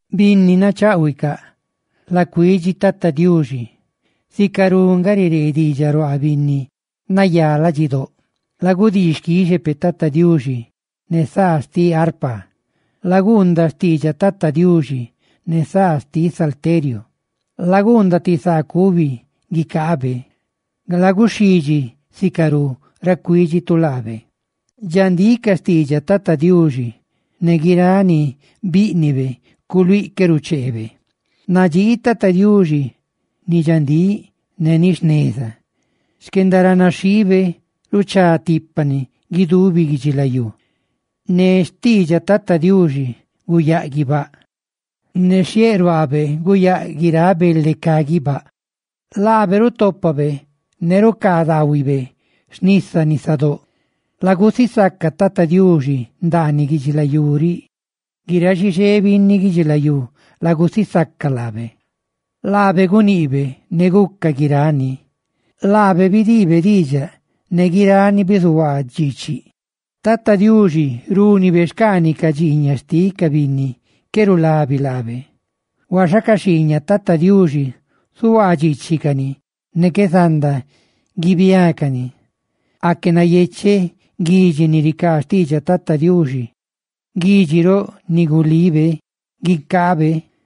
Binni nacháꞌhuicaꞌ, la cuidxi Tata Diuxi; sicarú nga riree diidxaꞌ ruaa binni nayá ladxidóꞌ. Lagudii xquixe peꞌ Tata Diuxi ne saa xtiꞌ arpa, laguundaꞌ xtiidxaꞌ Tata Diuxi ne saa xtiꞌ salteriu, laguundaꞌ ti saa cubi guicaabe, ¡laguxhidxi sicarú ora cuídxitu laabe! Dxandíꞌ ca xtiidxaꞌ Tata Diuxi; ne guiráꞌ ni bíꞌnibe culuíꞌ qué rucheebe. Nadxii Tata Diuxi ni dxandíꞌ ne ni jneza; ¡xquendaranaxhiibe ruchatipani guidubi guidxilayú! Ne xtiidxaꞌ Tata Diuxi guyáꞌ guibáꞌ, ne xhieꞌ ruaabe, guyáꞌ guiráꞌ bele cá guibáꞌ. Laabe rutópabe ne rucaa daahuibe xnisa nisadóꞌ. Laguisaca Tata Diuxi ndaaniꞌ guidxilayú riꞌ; ¡guiráꞌ xixé binni guidxilayú, lagusisaca laabe! Laabe guniꞌbe, ne guca guirani; laabe bidiibe diidxaꞌ, ne guirani bizuhuaa dxiichiꞌ. Tata Diuxi rúnibe xcaaniꞌ ca dxiiñaꞌ xtiꞌ ca binni qué rulabi laabe, huaxa ca xhiiñaꞌ Tata Diuxi zuhuaa dxiichicani ne qué zanda guibiácani. Aque nayecheꞌ guidxi ni ricaa xtiidxaꞌ Tata Diuxi, guidxi roꞌ ni gulibe guicaabe.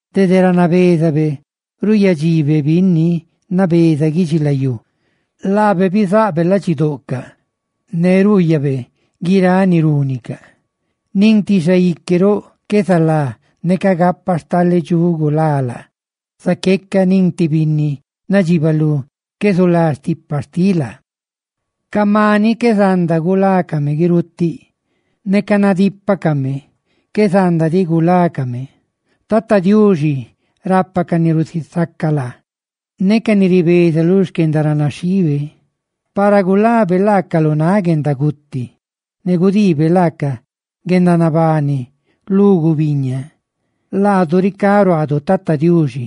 dede ra nabézabe ruuyadxibe binni nabeza guidxilayú; laabe bizaꞌbe ladxidoꞌcaꞌ, ne ruuyabe guiráꞌ ni rúnicaꞌ. Nin ti xaique roꞌ qué zalá neca gapa stale dxuꞌ gulá laa, zaqueca nin ti binni nadxibalú qué zulá stipa xtiꞌ laa; ca maniꞌ qué zanda gulacaꞌ guirutiꞌ; neca nadípacame, qué zanda diꞌ gulácame guirutiꞌ. Tata Diuxi, rapa ca ni rusisaca laa ne ca ni ribeza lu xquendaranaxhiibe, para gulabe laacaꞌ lu náꞌ guendaguti ne gudiibe laaca guendanabani lu gubiñaa. Laadu ricá ruaadu Tata Diuxi;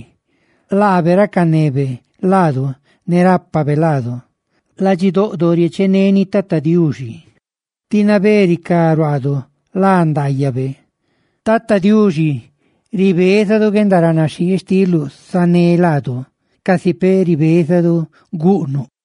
¡laabe racanebe laadu ne rápabe laadu! Ladxidoꞌdo riecheneni Tata Diuxi; tí nabé ricá ruaadu lá ndaayabe. ¡Tata Diuxi, ribézadu guendaranaxhii xtiluꞌ sané laadu, casi peꞌ ribézadu guꞌnuꞌ!